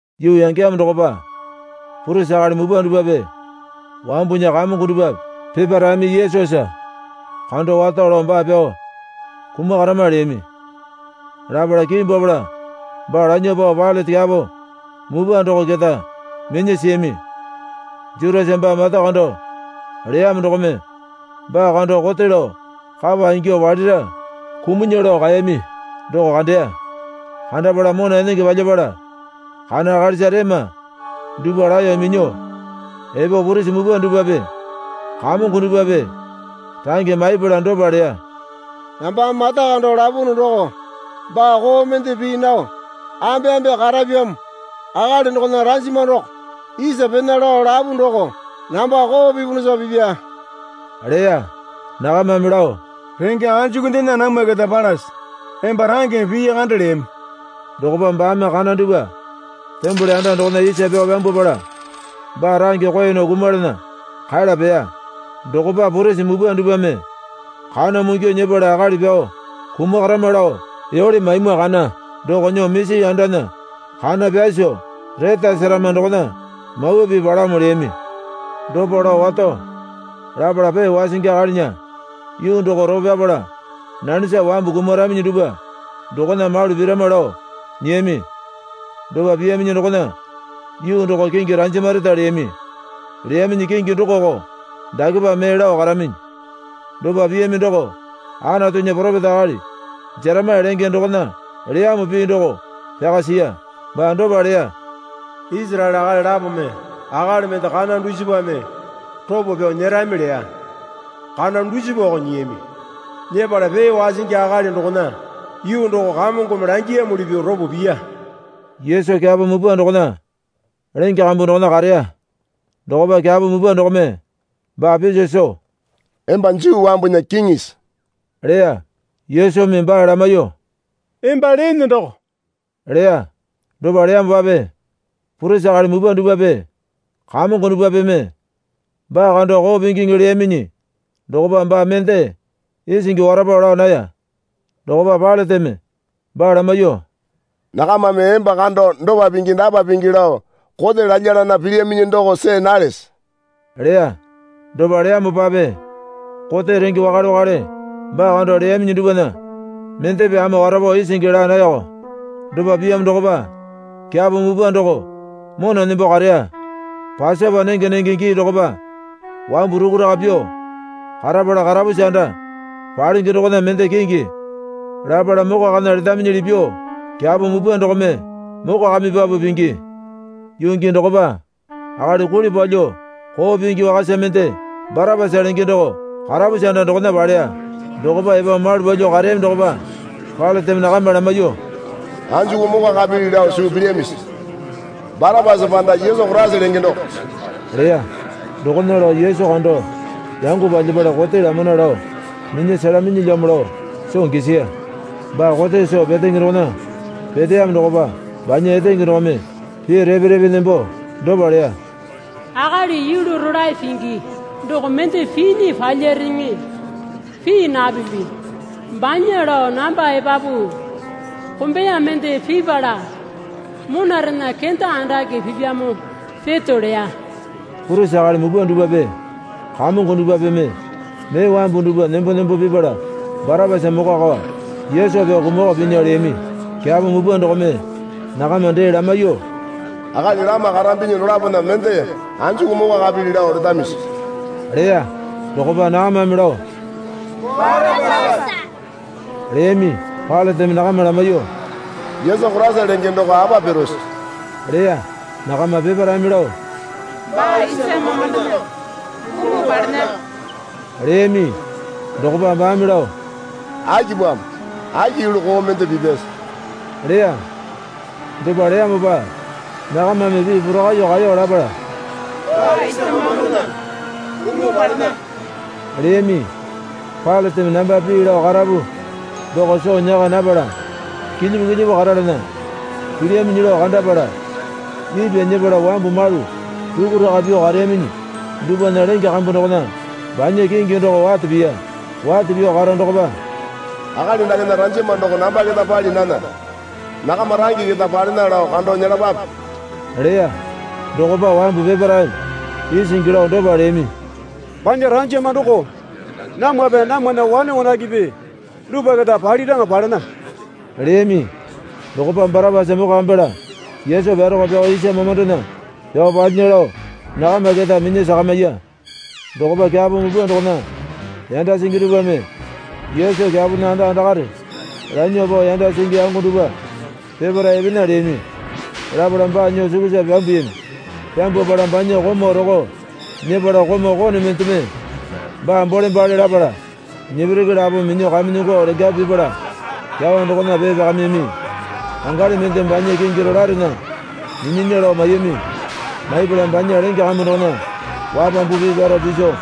Yuu yangeyamo dokopa purisi akali mupwa dupwape wambunya kamongo dupwape peparaeme Yesusa kando wato lao baa pyao kumakarama, leyami. Lapala kimbwapala baa lanyuo pao Pailate kyapo mupwa doko keta minya siyami. Jutasa baa mata kando leyamo dokome baa kando kote lao kapa ingyuo palira kumunya lao kaeyami doko kandeya. Kandapala mona enenge palyapala kana akalisa rema dupwa laeyo minyuo epo purisi mupwa dupwape kamongo dupwape range maipala dopa leya. Nambame mata kando lapunu doko baa koo mende pii nao ambeambe karapyamo akali dokona ranjama doko isa pena lao lapu doko namba koo pipunusa pipya, leya. Nakamame lao, Renge anjukundena namwa keta palase? Emba rangeme pii kande, leyami. Dokopa baame kana dupwa tembole anda dokona isa pyao pyambwapala baa range koe nao kumalana kala peya. Dokopa purisi mupwa dupwame kana mungyu nyepala akali pyao kumakarama lao yole maimwa kana doko nyuo misi andana kana pyasu retasarama dokona Mawa Pii palamo leyami. Dopa lao wato lapala pee wasingi akalinya yuu doko ropo pyapala nanesa wambu kumaraminyi dupwa dokona malu pirama lao nyiyami. Dopa piyaminyi dokona yuu doko kingi Ranjamareta leyami. Leyaminyi kingi dokoko dakepa mee lao karaminyi. Dopa piyami doko Anatunya poropeta akali Jeremaya lenge dokona leyamo pii doko pyaka siya. Baa dopa leya. Isaraele akali lapome akali mende kana dusipame ropo pyao nyerami leya. Kana dusipako nyiyami. Nyepala pee wasingi akali dokona yuu doko Kamongome langiyamuli pyuo ropo piya. Yesu kyapo mupwa dokona lenge kambu dokona kareya. Dokopa kyapo mupwa dokome baa piso soo, Emba Juu wambunya kiŋisi? leya. Yesumi baa lamaiyuo, Emba leene doko, leya. Dopa leyamopape purisi akali mupwa dupwape kamongo dupwapeme baa kando koo pingiŋi leyaminyi dokopa baa mende isingi warapo laa naya. Dokopa Pailateme baa lamaiyuo, Nakamame emba kando dopa pingi dapa pingi lao kote lalyalana pilyaminyi doko see nalese? leya. Dopa leyamopape kote renge wakale wakale baa kando leyaminyi dupwana mendepe ama warapo isingi laa nayako. Dopa piyamo dokopa kyapo mupwa doko mona nembo kareya. Pasopa nenge nenge gii dokopa wambu rukuraka pyuo karapala karapusi anda palenge dokona mende kingi lapala mokwakana letaminyili pyuo kyapo mupwa dokome mokwakamipapu pingi. Yuu gii dokopa akali kuli palyuo koo pingi wakasa mende Barapasa lenge doko karapusi anda dokona paleya. Dokopa epo malu palyuo kareyami dokopa Pailateme nakama lamaiyuo, Anjuku mokwakapili lao suu pilyamisi? Barapasa panda Yesu Koraisa lenge doko? leya. Dokona lao Yesu kando yango palyapala kote lamana lao minya selaminyilyamo lao soo gisiya. Baa kote soo petenge dokona peteyamo dokopa banya etenge dokome pii repe repe nembo dopa leya. Akali yulu rolae pingi doko mende pinya palyareŋe pii napipi. Banya lao namba epapu kombeya mende pipala monarena kenda andake pipyamo peto, leya. Purisi akali mupwa dupwape kamongo dupwapeme mee wambu dupwa nembo nembo pipala Barapasa mokwakao Yesu pyao kumakao pinya leyami. Kyapo mupwa dokome nakama dee lamaiyuo, Akali lama karambinyi dolapona mende anjuku mokwakapili lao letamisi? leya. Dokopa nakamame lao Barapasa, leyami. Pailateme nakama lamaiyuo, Yesu Koraisa lenge doko apa pirose? leya. Nakama peparaeme lao, Baa isa mamandona kumuo palena, leyami. Dokopa baame lao, Akipamo? Aki yulu koo mende pipyase? leya. Dopa leyamopa nakamame pii porakaiyuo kaeyo lapala, Baa isa mamandona kumuo palena, leyami. Pailateme namba pii lao karapu doko soo nyaka napala kilyipu kilyipu karalana pilyaminyi lao kandapala ipwa nyepala wambu malu rukuraka pyuo kareyaminyi dupwana lenge kambu dokona banya kingi doko wate piya. Wate pyuo karo dokopa, Akali dakena ranjama doko namba keta pali nana. Nakama range keta palena lao kando nyelapape, leya. Dokopa wambu peparaeme isingi lao dopa leyami. Banya ranjama doko namwape namwana wane wanakepe dupwa keta paliraŋa palena, leyami. Dokopa Barapasa mokwakamipala Yesu pyaroko pyao isa mamandona pyao palyinya lao nakama keta minya sakamiya. Dokopa kyapo mupwa dokona yanda singi dupwame Yesu kyapona anda andakare lanyuo pao yanda singi yango dupwa peparae epena leyami. Lapala baa nyuo sukusa pyambuyami. Pyambwapala banya komau roko nyepala komau kone mendeme baa bole bale lapala nepereke lapome minyuo kamenyongo lengapu pipala kyawa dokona pee pyakamiyami. Pangali mende banya kingi rolaerena minyinya lao maiyami. Maipala banya lenge kambu dokona wapambu pii pyaro piso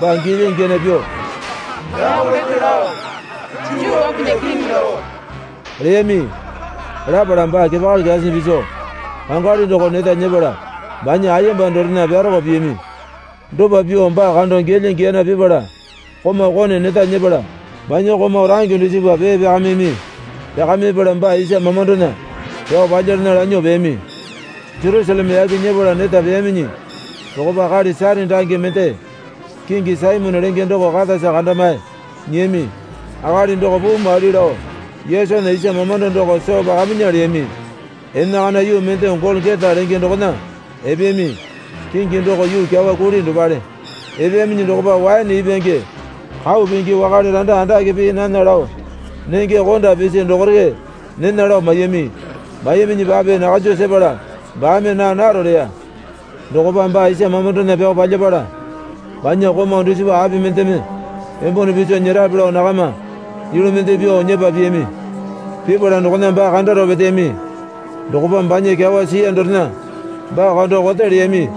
baa giyalya giyana pyuo, Yako lete lao Juu wambunya Kiŋi doko, leyami. Lapala baa kepakali kyasinyi piso pangali doko neta nyepala banya ayemba dorena pyaroko piyami. Dopa pyuo baa kando giyalya giyana pipala komau kone neta nyepala banya komau range dusipa pee pyakamiyami. Pyakamipala baa isa mamandona pyao palyalana lanyuo peyami. Jerusaleme yaki nyepala neta peyaminyi dokopa akali Sairini range mende kingi Saimone lenge doko katasa kandamae nyiyami. Akali doko puu maili lao Yesunya isa mamando doko soo pakaminya leyami. Enakana yuu mende Golokota lenge dokona epeyami. (Kingi doko yuu kyawa kuli dopale.) Epeyaminyi dokopa waene ipwange kau pingi wakale randa andake pii nana lao nenge konda pisi dokore nena lao maiyami. Maiyaminyipape nakanju sepala baame naa naro leya. Dokopa baa isa mamandona pyao palyapala banya komau dusipa api mendeme embone piso nyerape lao nakama yulu mende pyuo nyepa piyami. Pipala dokona baa kandaro peteyami. Dokopa banya kyawa siya dorena baa kando kote leyami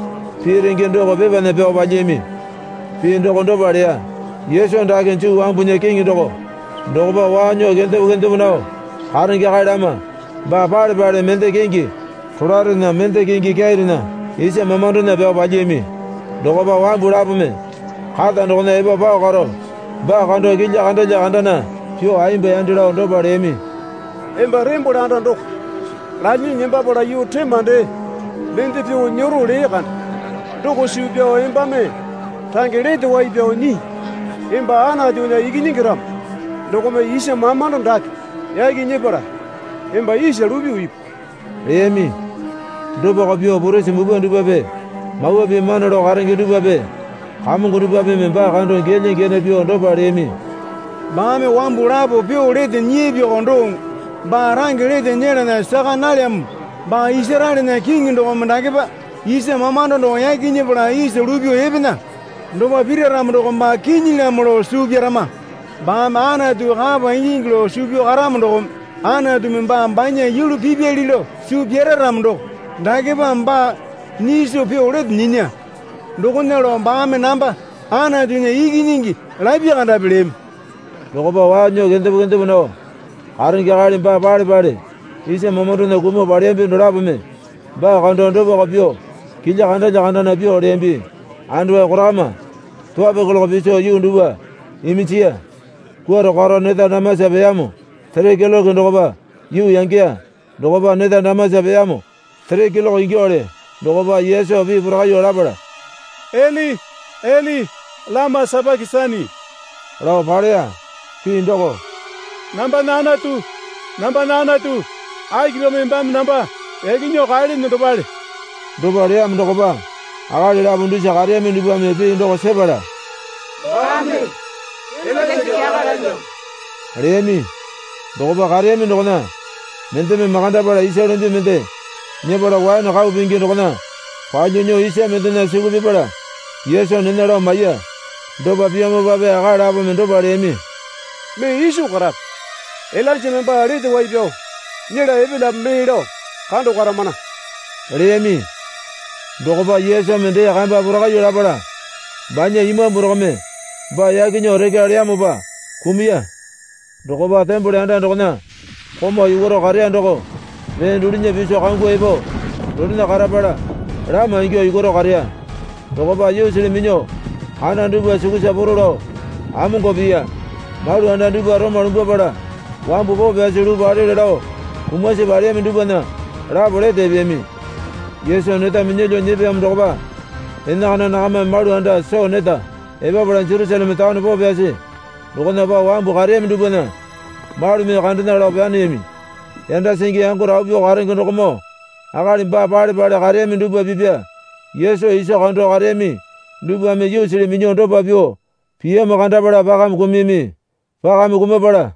pii renge doko pepana pyao palyiyami. Pii doko dopa leya. Yesu dake Juu wambunya Kiŋi doko. Dokopa waa nyuo kendepo kendepo nao karenge akali lama baa pale pale mende kingi rolaerena mende kingi kyairena isa mamandona pyao palyiyami. Dokopa wambu lapome kata dokona epo pao karo baa kando kilya kandalya kandana pyuo ayemba yande lao dopa leyami. Emba tembole anda doko lalyinyi nembapala yuu rema dee mende pyuo nyero lee kande doko suu pyao embame range lete wai pyuo nyii. Emba Anatunya Ikinyingi ramo dokome isa mamando dake yaki nyepala emba isa lupyuo ipu, leyami. Dopako pyuo purisi mupwa dupwape Mawa Pii mana lao karenge dupwape kamongo dupwapeme baa kando giyalya giyana pyuo dopa leyami. Baame wambu lapo pyuo lete nyiyapyako doŋo baa range lete nyelana saka nalyamo. Baa Isaraelena Kiŋi dokome dakepa isa mamando doko yaki nyepala isa lupyuo epena. Dopa pira ramo doko baa kinyilyamo lao suu pyarama. Baame Anatu kapa ingingi lao suu pyao karamo dokome Anatumi baa banya yulu pipyali lao suu pyara ramo doko dakepa baa nyiso pyuo lete nyinya. Dokona lao baame namba Anatunya Ikinyingi lapya kandapi, leyami. Dokopa waa nyuo kendepo kendepo nao karenge akali baa pale pale isa mamandona kumuo paleyambi dolapome baa kando dopako pyuo kilya kandalya kandana pyuo leyambi. Andawai korakama towalo keloke piso yuu dupwa iminjiya. Kwuarao karo neta damasa peyamo sere keloke dokopa yuu yangeya. Dokopa neta damasa peyamo sere keloke ingyuowale dokopa Yesu pii porakaiyuo lapala, Eli, Eli lama sapakesani, lao paleya. Pii doko, Nambana Anatu, nambana Anatu, akipamo embame namba yaki nyuo kaelene dopale. Dopa leyamo dokopa akali lapo dusa kareyami dupwame pii doko sepala, Baame Ilainja kyakale lalyamo, leyami. Dokopa kareyami dokona mendeme makandapala isa lumbi mende nyepala waene kau pingi dokona palyuo nyuo isa mendena suku pipala Yesu nena lao maiya. Dopa piyamopape akali lapome dopa leyami. Mee iso karape. Ilainjame baa lete wai pyao nyela epelyape mee lao kando karamana, leyami. Dokopa Yesumi dee kamba porakaiyuo lapala banya imambu dokome baa yaki nyuo rekya leyamopa kumuya. Dokopa tembole anda dokona komau yukwaro kareya doko mee dulunya piso kangu epo donena karapala lama ingyuo yukwaro kareya. Dokopa yuusili minyuo kana dupwa sukusa poro lao amongwao piya. Malu anda dupwa roma lumbwapala wambu poo pyasi luu palele lao kumasi paleyami dupwana lapo lete epeyami. Yesu neta minyalyuo nyepeyamo dokopa enakana nakamame malu anda soo neta epapala Jerusaleme taone poo pyasi dokona pao wambu kareyami dupwana malumi kandena lao paneyami. Yanda singi yango rapu pyuo karenge dokomoo akali baa pale pale kareyami dupwa pipya Yesu iso kando kareyami dupwame yuusili minyuo dopa pyuo piyamo kandapala pakame kumuyami. Pakame kumapala,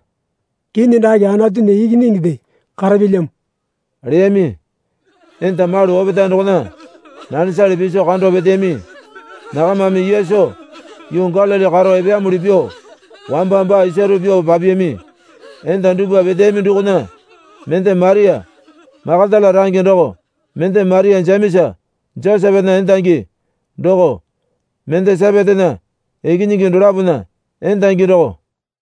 Kinyi dake Anatunya ikinyinginde karapyalyamo, leyami. Enda malu opetae dokona nanesale piso kando peteyami. Nakamame Yesu yuu Galili karo epeyamuli pyuo wamba baa isaru pyuo papiyami. Enda dupwa peteyami dokona mende Maria Makatala range doko mende Maria Jemesa Josepepana endangi doko mende Sepetena ikinyingi dolapona endangi doko.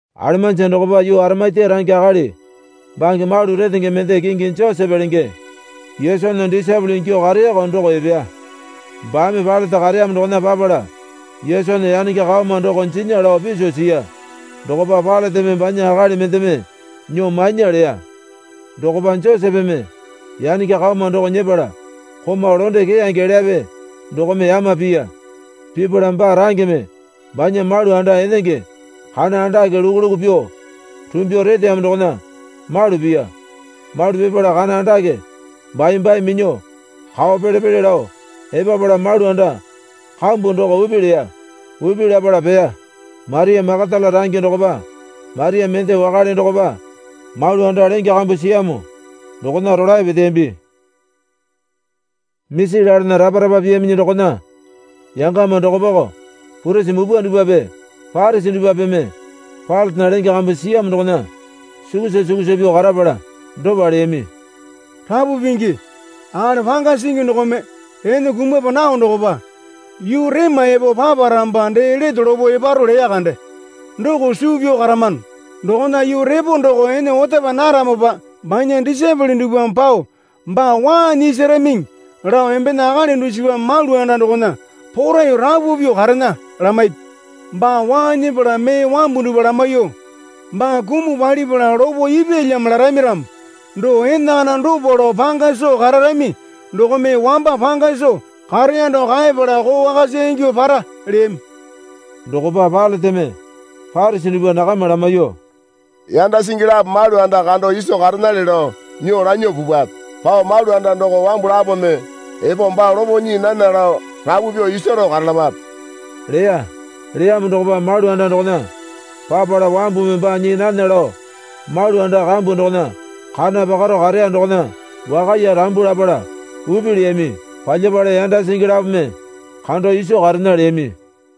Alemanji dokopa yuu Arimatia range akali bange malu retenge mende kingi Josepe lenge Yesunya disaepole ingyuo kareyako doko epeya. Baame Pailate kareyamo dokona papala Yesunya yanenge kaoma doko jinya lao piso siya. Dokopa Pailateme banya akali mendeme nyuo mainya leya. Dokopa Josepeme yanenge kaoma doko nyepala komau londe keyange elyape dokome yama piya. Pipala baa rangeme banya malu anda enenge kana andake luku luku pyuo rumbyuo reteyamo dokona malu piya. Malu pipala kana andake bai bai minyuo kao pele pele lao epapala malu anda kambu doko upi leya. Upi lapala peya. Maria Makatala range dokopa Maria mende wakale dokopa malu anda lenge kambu siyamo dokona rolae peteyambi. Misi lalana rapa rapa piyaminyi dokona yangama dokopako purisi mupwa dupwape Parisi dupwapeme Pailatena lenge kambu siyamo dokona sukusa sukusa pyuo karapala dopa leyami. Rapu Pingi, akali panga singi dokome ene kumapa nao dokopa, yuu rema epo paparamopa dee lete lopo eparo leya kande doko suu pyao karamano. Dokona yuu repo doko ene otapa naramopa banya disaepole dupwame pao baa waa nyisaramiŋi lao embena akali dusipame malu anda dokona poraiyuo rapu pyuo karena lamaipi. Baa waa nyepala mee wambu dupwa lamaiyuo, Baa kumuo palipala lopo ipyalyamo larami ramo doko enakana dopa lao panga soo kararami dokome wamba panga soo kareya doko kaeyapala koo wakasa ingyuo para, leyami. Dokopa Pailateme Parisi duwpa nakama lamaiyuo, Yanda singi lapo malu anda kando iso karenale lao nyuo lanyuo pupwape. Pao malu anda doko wambu lapome epo baa lopo nyii nana lao rapu pyuo isaro karalapape, leya. Leyamo dokopa malu anda dokona papala wambumi baa nyii nana lao malu anda kambu dokona kana pakaro kareya dokona wakaiye rambu lapala upi leyami. Palyapala yanda singi lapome kando iso karena leyami.